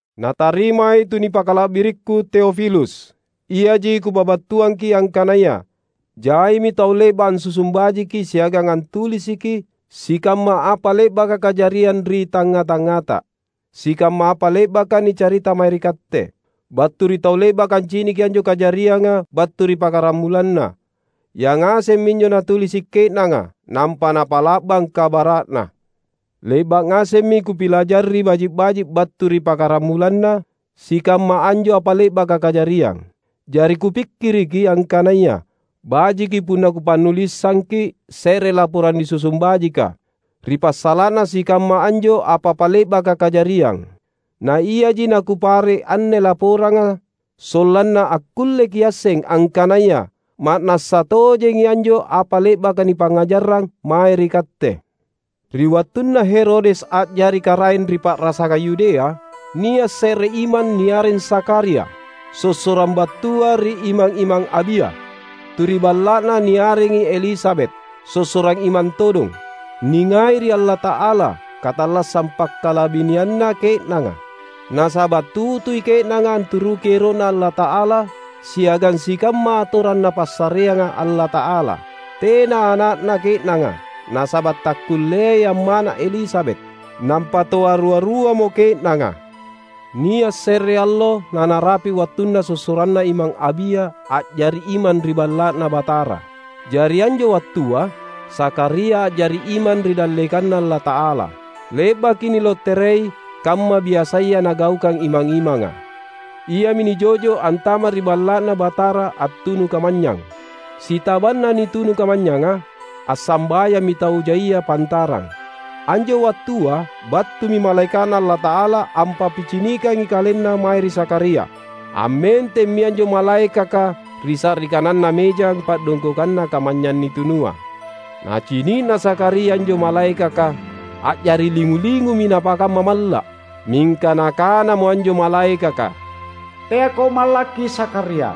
Natarimai tu nipakala’birikku Teofilus, Iaji kupabattuangki’ angkanaya, jaimi tau le’ba’ ansusung bajiki siagang antulisiki sikamma apa le’baka kajariang ri tangnga-tangngata. Sikamma apa le’baka nicarita mae ri katte, battu ri tau le’baka anciniki anjo kajarianga battu ri pakkaramulanna, yangaseng minjo natulisi’ ke’nanga, nampa napa’la’bang kabara’na. Le’ba’ ngasemmi kupilajari baji’-baji’ battu ri pakkaramulanna sikamma anjo apa le’baka kajariang. Jari kupikkiriki angkanaya, bajiki punna kupannulisangki’ se’re laporang nisusung bajika ri passala’na sikamma anjo apa-apa le’baka kajariang. Na iaji nakupare’ anne laporanga, sollanna akkulle kiasseng angkanaya ma’nassa tojengi anjo apa le’baka nipangngajarrang mae ri katte. Ri wattunna Herodes a’jari karaeng ri pa’rasangang Yudea, nia’ se’re imang niareng Zakharia, sossorang battua ri imang-imang Abia. Tu ri balla’na niarengi Elisabet, sossorang imang todong. Ningai ri Allata’ala katallassang pakkalabinianna ke’nanga. Nasaba’ tutui ke’nanga anturuki ero’Na Allata’ala siagang sikamma atorang Napassareanga Allata’ala. Tena ana’na ke’nanga, nasaba’ takkulleai ammana’ Elisabet. Nampa toa rua-ruamo ke’nanga. Nia’ se’re allo na narapi’ wattunna sossoranna Imang Abia a’jari imang ri Balla’Na Batara. Jari anjo wattua, Zakharia a’jari imang ri dallekanNa Allata’ala. Le’baki niloterei, kamma biasaya nagaukang imang-imanga, iami nijo’jo’ antama’ ri Balla’Na Batara attunu kamanynyang. Sitabanna nitunu kamanynyanga, assambayammi tau jaia pantarang. Anjo wattua battumi malaeka’Na Allata’ala ampappicinikangi kalenna mae ri Zakharia. Ammentemmi anjo malaekaka ri sa’ri kananna mejang pa’dongkokanna kamanynyang nitunua. Nacini’na Zakharia anjo malaekaka, a’jari lingu-lingumi napakamma malla’. Mingka nakanamo anjo malaekaka, "Teako mallakki Zakharia!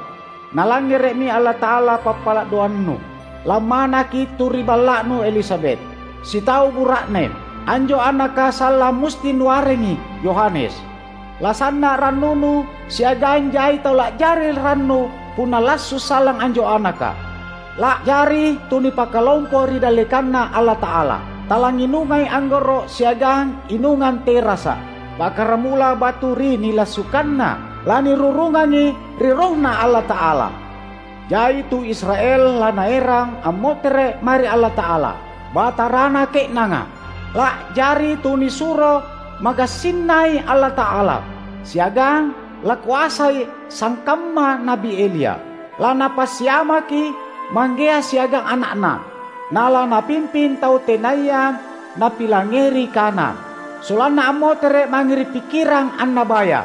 Nalangngere’mi Allata’ala pappala’ doannu. Lammanaki tu ri balla’nu Elisabet, sitau bura’ne. Anjo anaka sallang musti nuarengi Yohanes. Lasanna’ rannunu, siagang jai tau la’jari rannu punna lassu’ sallang anjo anaka! La’jari tu nipakalompoi ri dallekanNa Allata’ala. Talangnginungai anggoro’ siagang inungang terasa’. Pakkaramula battu ri nilassukanna lanirurungangi ri RohNa Allata’ala. Jai tu Israel lanaerang ammotere’ mae ri Allata’ala, Batarana ke’nanga. La’jari tunisuro magassinNai Allata’ala, siagang lakoasai sangkamma Na’bi Elia. Lanapassiamaki manggea siagang ana’na. Na lanapimping tau tenaya nappilangngeri kana sollanna ammotere’ mange ri pikkirang annabaya.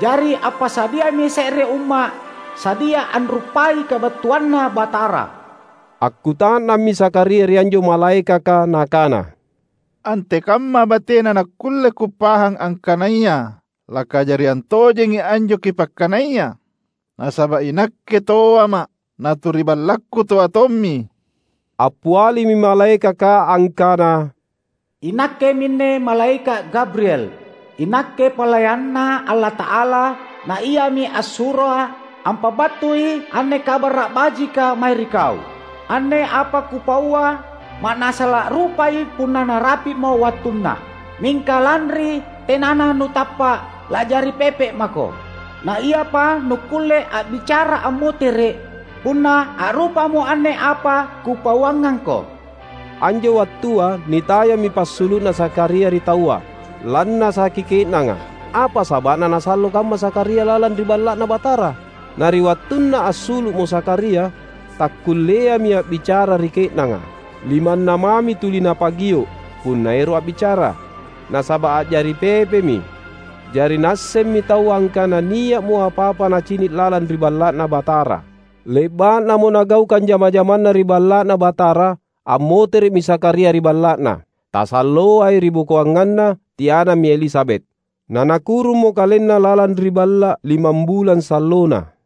Jari appasadiami se’re umma’ sadia anruppai kabattuanNa Batara." Akkuta’nammi Zakharia ri anjo malaekaka nakana, "Antekamma batena nakkulle kupahang angkanaya lakajariang tojengi anjo kipakkanaya? Nasaba’ inakke toama’, na tu ri ballakku toa tommi." Appialimi malaekaka angkana, "Inakke minne malaeka’ Gabriel. Inakke palayanNa Allata’ala, na Iami assuroa’ ampabattui anne kabara’ bajika mae ri kau. Anne apa kupaua, ma’nassa la’rupai punna narapi’mo wattunna. Mingka lanri tenana nutappa’, la’jari pepe mako; na iapa nukkulle a’bicara ammotere’, punna a’rupamo anne apa kupauangangko." Anjo wattua, nitayammi passulu’na Zakharia ri taua. Lannasaki ke’nanga, apa saba’na nasallo kamma Zakharia lalang ri Balla’Na Batara. Na ri wattunna assulu’mo Zakharia, takkulleami a’bicara ri ke’nanga. Limanna mami tuli napagio’ punna ero’ a’bicara, nasaba’ a’jari pepemi. Jari naassemmi taua angkana nia’mo apa-apa nacini’ lalang ri Balla’Na Batara. Le’ba’namo nagaukang jama-jamanna ri Balla’Na Batara, ammotere’mi Zakharia ri balla’na. Tasalloai ribokoanganna, tianammi Elisabet, na nakurummo kalenna lalang ri balla’ limambulang sallona.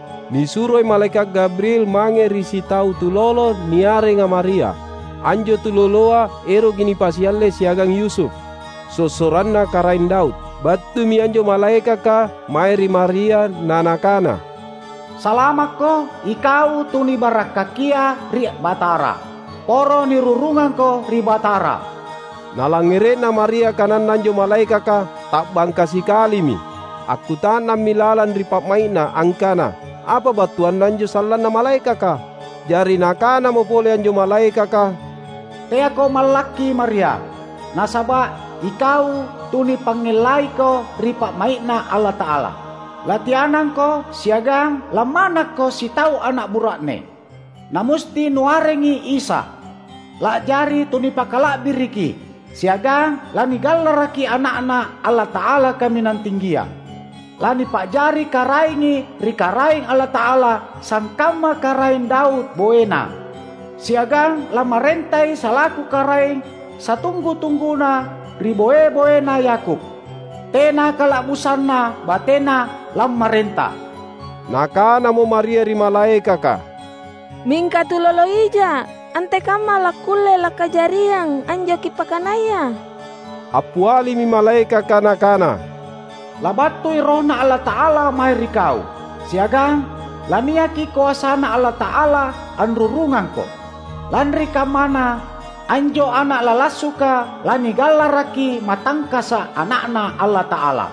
Nisuroi malaeka’ Gabriel mange ri sitau tulolo niarenga Maria. Anjo tuloloa eroki nipasialle siagang Yusuf, sossoranna Karaeng Daud. Battumi anjo malaekaka mae ri Maria na nakana, "Salamakko, ikau tu nibarakkakia ri Batara! Poro nirurungangko ri Batara!" Nalangngere’na Maria kananna anjo malaekaka, ta’bangka sikalimi. Akkuta’nammi lalang ri pa’mai’na angkana apa battuanna anjo sallanna malaekaka. Jari nakanamo pole anjo malaekaka, "Teako mallakki Maria, nasaba’ ikau tu nipangngellaiko ri pa’mai’Na Allata’ala. Latianangko, siagang lammanakko sitau ana’ bura’ne, na musti nuarengi Isa. La’jari tu nipakala’biriki, siagang lanigallaraki Ana’Na Allata’ala Kaminang Tinggia. Lanipa’jari KaraengI ri Karaeng Allata’ala sangkamma Karaeng Daud boeNa. Siagang lammarentai salaku Karaeng satunggu-tungguna ri boe-boena Yakub. Tena kala’busanna bateNa lammarenta." Nakanamo Maria ri malaekaka, "Mingka tulolo ija’, antekamma lakkulle lakajariang anjo kipakkanaya?" Appialimi malaekaka nakana, "Labattui RohNa Allata’ala mae ri kau, siagang laniaki koasaNa Allata’ala anrurungangko. Lanri kammana, anjo ana’ lalassuka lanigallaraki Matangkasa’, Ana’Na Allata’ala.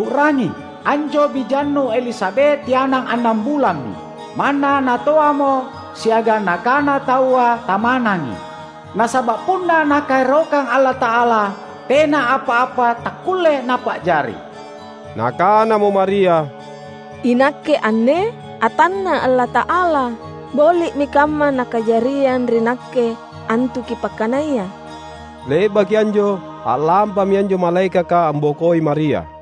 U’rangi: anjo bijannu Elisabet tianang annang bulammi, manna natoamo, siagang nakana taua tamanangi. Nasaba’ punna Nakaerokang Allata’ala, tena apa-apa takkulle Napa’jari." Nakanamo Maria, "Inakke anne, atanNa’ Allata’ala; boli’mi kamma nakajariang ri nakke, antu kipakkanaya." Le’baki anjo a’lampami anjo malaekaka ambokoi Maria.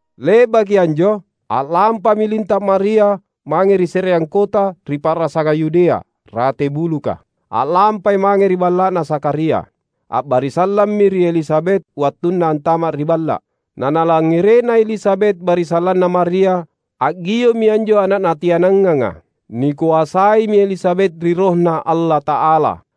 Le’baki anjo, a’lampami linta’ Maria mange ri se’reang kota ri pa’rasangang Yudea, rate buluka. A’lampai mange ri balla’na Zakharia. A’barisallammi ri Elisabet wattunna antama’ ri balla’. Na nalangngere’na Elisabet barisallanna Maria, a’gio’mi anjo ana’ natiananganga. Nikoasaimi Elisabet ri RohNa Allata’ala;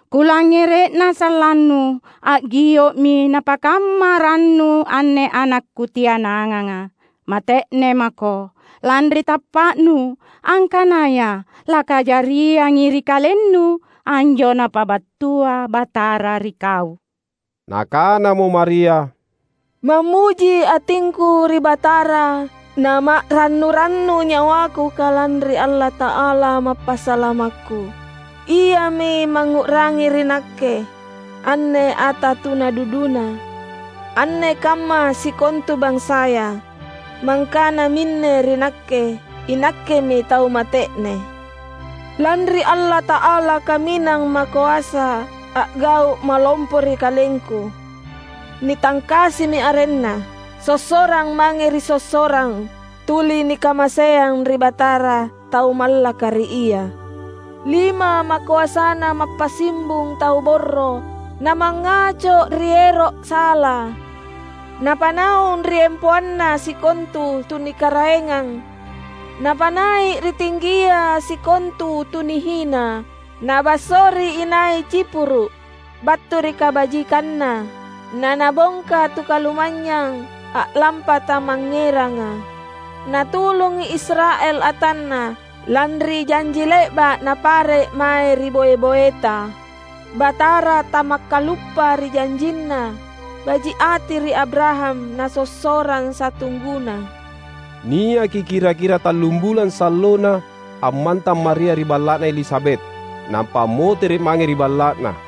Kulangngere’na sallannu, a’gio’mi napakamma rannu anne ana’ kutiananganga. Mate’ne mako, lanri tappa’nu angkanaya lakajariangi ri kalennu anjo Napabattua Batara ri kau!" Nakanamo Maria, "Mammuji atingku ri Batara, nama’rannu-rannu nyawaku kalanri Allata’ala Mappasalamakku. Iami mangngu’rangi ri nakke, anne ata tuna duduNa! Anne kamma sikontu bansaya mangkana minne ri nakke, inakkemi tau mate’ne. Lanri Allata’ala Kaminang Makoasa a’gau’ malompo ri kalengku. Nitangkasimi arenNa. Sossorang mange ri sossorang tuli nikamaseang ri Batara tau mallaka ri Ia. Lima makoasaNa mappasimbung tau borro, na mangngaco ri ero’ sala. Napanaung ri empoanna sikontu tu nikaraengang napanai’ ri tinggia, sikontua tu nihina. Nabassori inai cipuru’, battu ri kabajikanNa naNabongka tu kalumanynyang a’lampa tamangngeranga. Natulungi Israel atanNa, lanri janji le’ba’ Napare’ mae ri boe-boeta. Batara tamakkaluppa ri janjinNa baji’ ati ri Abraham na sossorang satungguna." Niaki kira-kira tallum bulang sallona ammantang Maria ri balla’na Elisabet, nampa ammotere’ mange ri balla’na.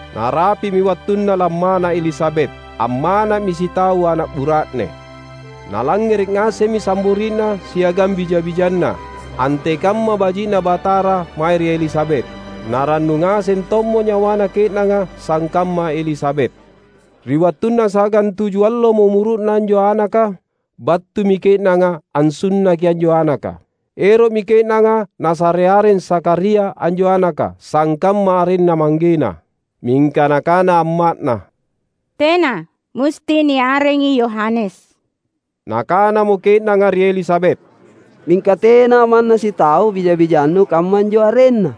Narapi’mi wattunna lammana’ Elisabet. Ammana’mi sitau ana’ bura’ne. Nalangngere’ ngasemmi sambori’na siagang bija-bijanna antekamma baji’na Batara mae ri Elisabet. Na rannu ngaseng tommo nyawana ke’nanga sangkamma Elisabet. Ri wattunna sagantuju allomo umuru’na anjo anaka, battumi ke’nanga ansunnaki anjo anaka. Ero’mi ke’nanga nasare areng Zakharia anjo anaka, sangkamma arenna manggena. Mingka nakana amma’na, "Tena, musti niarengi Yohanes." Nakanamo ke’nanga ri Elisabet, "Mingka tena manna sitau bija-bijannu kammanjo arenna."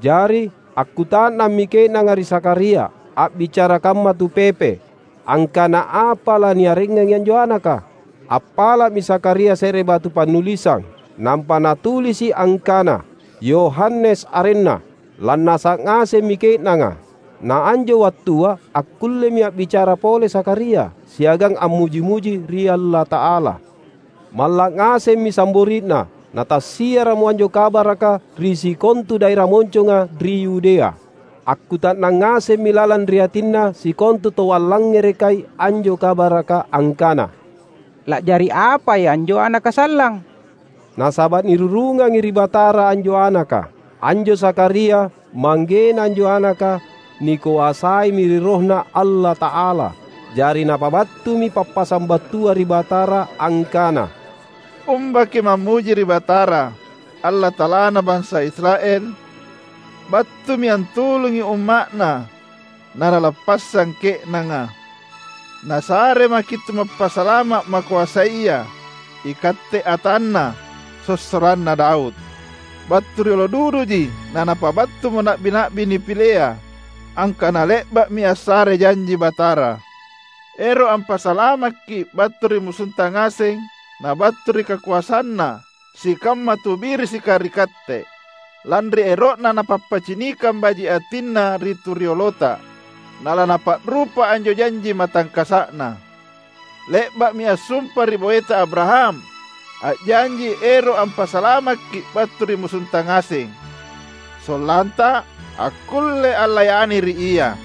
Jari, akkuta’nammi ke’nanga ri Zakharia, a’bicara kamma tu pepe, angkana apa laniarengangi anjo anaka. Appala’mi Zakharia se’re batu pannulisang nampa natulisi’ angkana, "Yohanes arenna." Lannasa’ ngasemmi ke’nanga. Na anjo wattua akkullemi a’bicara pole Zakharia siagang ammuji-muji ri Allata’ala. Malla’ ngasemmi sambori’na; na tassiara’mo anjo kabaraka ri sikontu daera monconga ri Yudea. Akkuta’nang ngasemmi lalang ri atinna sikontu tau allangngerekai anjo kabaraka angkana, "La’jari apai anjo anaka sallang?" Nasaba’ nirurungangi ri Batara anjo anaka. Anjo Zakharia, manggena anjo anaka, nikoasaimi ri RohNa Allata’ala. Jari napabattumi pappasang battua ri Batara, angkana, "Umba kimammuji ri Batara, Allata’alana bansa Israel! Battumi antulungi umma’Na na Nalappassang ke’nanga. Nasaremaki’ tu Mappasalama’ makoasaya, ikatte atanNa, sossoranna Daud. Battu ri riolo duduji na Napabattumo na’bi-na’bi nipilea, angkana le’ba’mi assare janji Batara ero’ ampasalamakki’ battu ri musunta ngaseng na battu ri kakoasanna sikamma tu birisika ri katte. Lanri ero’Na napappicinikang baji’ atinNa ri tu riolota, na laNapa’rupa anjo janji matangkasa’Na. Le’ba’mi assumpa ri boeta Abraham, a’janji ero’ ampasalamakki’ battu ri musunta ngaseng, sollanta akkulle allayani ri Ia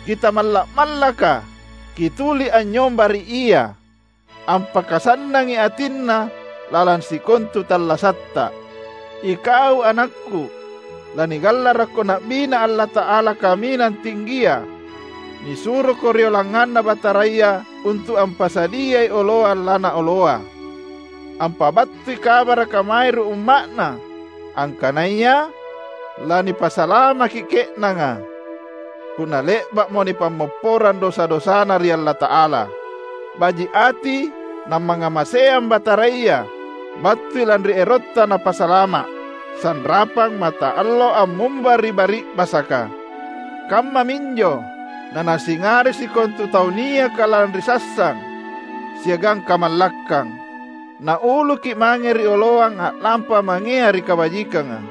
kitamalla’-mallaka, kituli anynyomba ri Ia, ampakasannangi atinNa lalang sikontu tallasatta. Ikau anakku, lanigallarakko na’biNa Allata’ala Kaminang Tinggia. Nisuroko rioloangangnganNa Bataraya untu’ ampasadiai oloang laNaoloa, Ampabattui kabaraka mae ri umma’Na angkanaya lanipasalamaki ke’nanga, punna le’ba’mo nipammopporang dosa-dosana ri Allata’ala. Baji’ ati na mangngamaseang Bataraya; battui lanri erotta Napasalama’. Sanrapang mataallo ammumba ri bari’basaka, kammaminjo na Nasingari sikontu taua niaka lalang ri sassang siagang kamallakkang. Nauluki’ mange ri oloang a’lampa mangea ri kabajikanga."